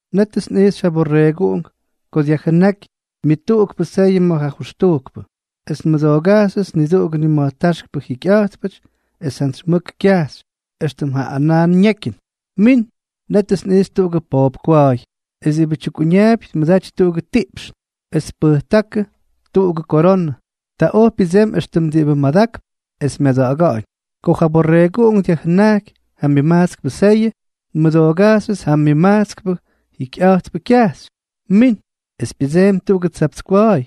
Nétʉts nꞌijxy ja Borreeguꞌunk ko dyajjʉnáky myʉtuꞌukpʉ seyʉ ma̱ ja jʉxtujkpʉ. Es nmʉdoogajxyʉts niduꞌugʉ nima̱jtáxkpʉ jikyꞌa̱jtpʉty, es jantsy mʉk kyajxy, éxtʉm ja anaa ñekyʉn: —¡Min! Nétʉts nꞌijxy tuꞌugʉ poop kwa̱a̱y, es diꞌibʉ tyukꞌuñaapy tmʉdaty tuꞌugʉ tiꞌpxn, es tpʉjtákʉdʉ tuꞌugʉ koronʉ. Ta oj pyʉdsemy éxtʉm diꞌibʉ madakp es myada̱ꞌa̱ga̱ꞌa̱ñ. Ko ja Borreeguꞌunk dyajjʉnajky ja myʉmajtskpʉ seyʉ, nmʉdoogajxyʉts ja myʉmajtskpʉ jikyꞌa̱jtpʉ kyajxy: —¡Min! Es pyʉdseemy tuꞌugʉ tsapts kwa̱a̱y.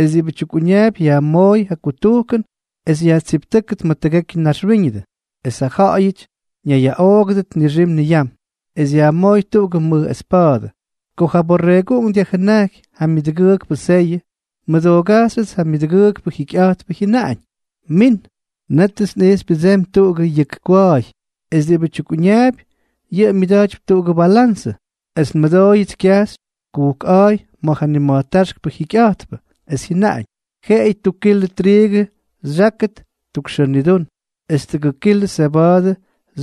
Es diꞌibʉ tyukꞌuñaapy yajmooy ja kutujkʉn es yajtsiptʉ́kʉt ma̱ tʉgekyʉ naxwíñʉdʉ, es ja ja̱ꞌa̱yʉty ñayyaꞌoogʉdʉt nixim niyam. Es yajmooy tuꞌugʉ mʉj espa̱a̱dʉ. Ko ja Borreeguꞌunk dyajjʉnajky ja myʉdʉgʉʉkpʉ seyʉ, nmʉdoogajxyʉts ja myʉdʉgʉʉkpʉ jikyꞌa̱jtpʉ jyʉnaꞌañ: —¡Min! Nétʉts nꞌijxy pyʉdsemy tuꞌugʉ yʉk kwa̱a̱y. Es diꞌibʉ tyukꞌuñaapy, yʉꞌʉ myʉda̱jtypy tuꞌugʉ balanzʉ. Es nmʉdooyʉts kyajxy kujkꞌa̱a̱y ma̱ ja nima̱jtáxkpʉ jikyꞌa̱jtpʉ, es jyʉnaꞌañ: —Jeꞌeyʉ tuk kilʉ triigʉ xyákʉt tuk xʉʉ nidún, es tʉgʉk kilʉ seba̱a̱dʉ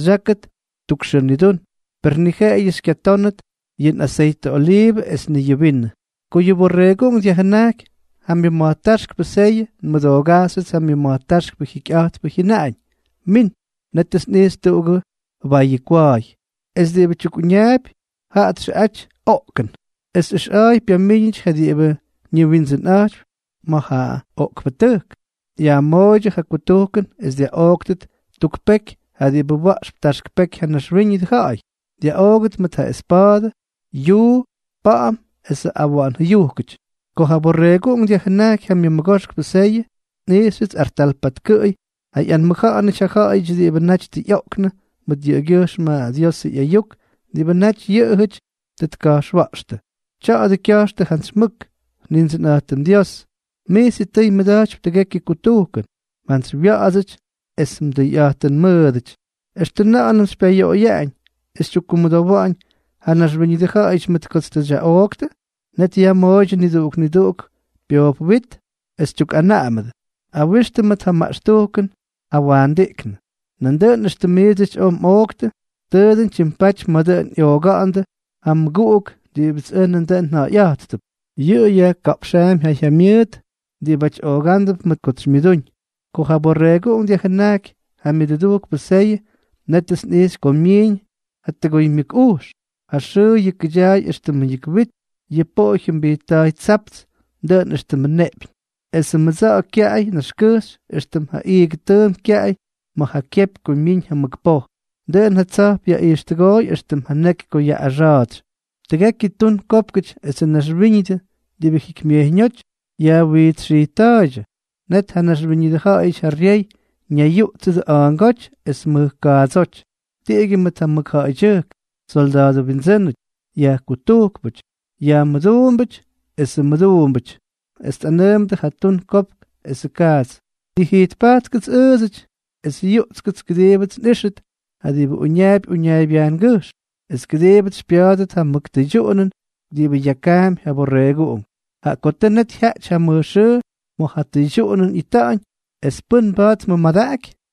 xyákʉt tuk xʉʉ nidún, per ni jeꞌeyʉ xykyatónʉt yʉ aseytʉ oliivʉ es ni yʉ vinʉ. Ko yʉ Borreeguꞌunk dyajjʉnajky ja myʉma̱jtáxkpʉ seyʉ, nmʉdoogajxyʉts ja myʉma̱jtáxkpʉ jikyꞌa̱jtpʉ jyʉnaꞌañ: —¡Min! Nétʉts nꞌijxy tuꞌugʉ bayʉ kwa̱a̱y. Es diꞌibʉ tyukꞌuñaapy, jaꞌa txʉꞌaty Oꞌkʉn. Es ʉxꞌa̱a̱y pyamíñʉty ja diꞌibʉ ñiwindsʉnꞌa̱jtypy ma̱ ja oꞌkpʉtʉjk. Yajmooydyʉ ja kutujkʉn es dyaꞌooktʉt tuk peky ja diꞌibʉ wa̱ꞌxp taxk peky ja naxwíñʉdʉ ja̱ꞌa̱y, dyaꞌoogʉt mʉt ja espa̱a̱dʉ, yuu, pa̱ꞌa̱m esʉ awa̱ꞌa̱n jʉyujkʉty. Ko ja Borreeguꞌunk dyajjʉnajky ja myʉmʉgoxkpʉ seyʉ, nꞌijxyʉts artal patkʉꞌʉy ja ꞌyanmʉja̱ꞌa̱nʉty ja ja̱ꞌa̱yʉty diꞌibʉ naty tʉ ꞌyooktʉ mʉt yʉꞌʉgyʉjxm ja Diosʉ ꞌyayuk diꞌibʉ naty yʉꞌʉjʉty tʉ tka̱jxwa̱ꞌxtʉ. Tya̱a̱dʉ kya̱jxtʉ jantsy mʉk: —Nindsʉnꞌa̱jtʉm Dios, mij sitʉy mmʉda̱jtypy tʉgekyʉ kutujkʉn. Mjantsywya̱ꞌa̱dsʉty es mdʉyꞌa̱jtʉnmʉʉdʉty. ¿Extʉ na̱ꞌa̱nʉm xypyayoꞌoyaꞌañ es xytyukkumʉdowa̱ꞌa̱ñ ja naxwíñʉdʉ ja̱ꞌa̱yʉty mʉt kots tʉ xyaꞌooktʉ? Net yajmooydyʉ niduꞌuk niduꞌuk pyoop wit, es tyukꞌanaꞌamʉdʉ: —Awixtʉ mʉt ja maꞌxtujkʉn jawaandiꞌknʉ. Nandʉꞌʉn éxtʉm miidsʉty oj mꞌooktʉ, tʉʉ dʉn tyimpatypy ma̱ dʉn ꞌyooga̱ꞌa̱ndʉ ja mmʉguꞌuk diꞌibʉts ʉj nandʉꞌʉn nja̱ꞌa̱yꞌa̱jttʉp. Yʉꞌʉ yajka̱ꞌpxaampy ja jyamyʉʉt diꞌibáty oogándʉp mʉt kots xymyʉdúñ. Ko ja Borreeguꞌunk dyajjʉnajky ja myʉdʉdujkpʉ seyʉ, nétʉts nꞌixy ko myiiñ ja tʉgoymyʉk ujx, ja xʉʉ yʉkʉdyaay éxtʉmʉ yʉk wit, yʉ poꞌo jyʉmbijtta̱a̱y tsapts, dʉꞌʉn éxtʉmʉ neꞌpyñ, esʉ mʉdsa̱ꞌa̱ kyaꞌay naxkʉjxy éxtʉm ja iigʉ tʉʉmp kyaꞌay ma̱ ja kyepy ko myiñ ja mʉk poj. Dʉꞌʉn ja tsa̱jp yaꞌijxtʉgooy éxtʉmʉ neky ko yaꞌꞌaxa̱a̱tsy. Tʉgekyʉ tun kópkʉty esʉ naxwíñʉdʉ diꞌibʉ jikymyejyñóty yajwijtsxijtta̱a̱ydyʉ. Net yʉ naxwíñʉdʉ ja̱ꞌa̱yʉty ja ryey ñayyuꞌtsʉdʉ a̱a̱ngóty es mʉj kaadsóty, tiꞌigyʉ mʉt ja mʉkja̱ꞌa̱ydyʉjk, solda̱a̱dʉ wyindsʉ́nʉty, yajkutujkpʉty, yajmʉduumbʉty esʉ mʉduumbʉty, es tꞌanʉʉmʉdʉ ja tun kopk esʉ kaats: —Nijijtpajtkʉts ʉʉdsʉty es yuꞌtskʉts kʉdiibʉts xꞌíxʉt ja diꞌibʉ uñaapy uñaaybyajngʉjxm, es kʉdiibʉts xypya̱a̱dʉt ja mʉk tʉydyuꞌunʉn diꞌibʉ yakaampy ja Borreeguꞌunk, jaꞌa ko tʉ net jyaꞌty ja mʉj xʉʉ ma̱ ja tʉydyuꞌunʉn ꞌyita̱ꞌa̱ñ, ¿es pʉ́n mba̱a̱t tmʉmadaꞌaky?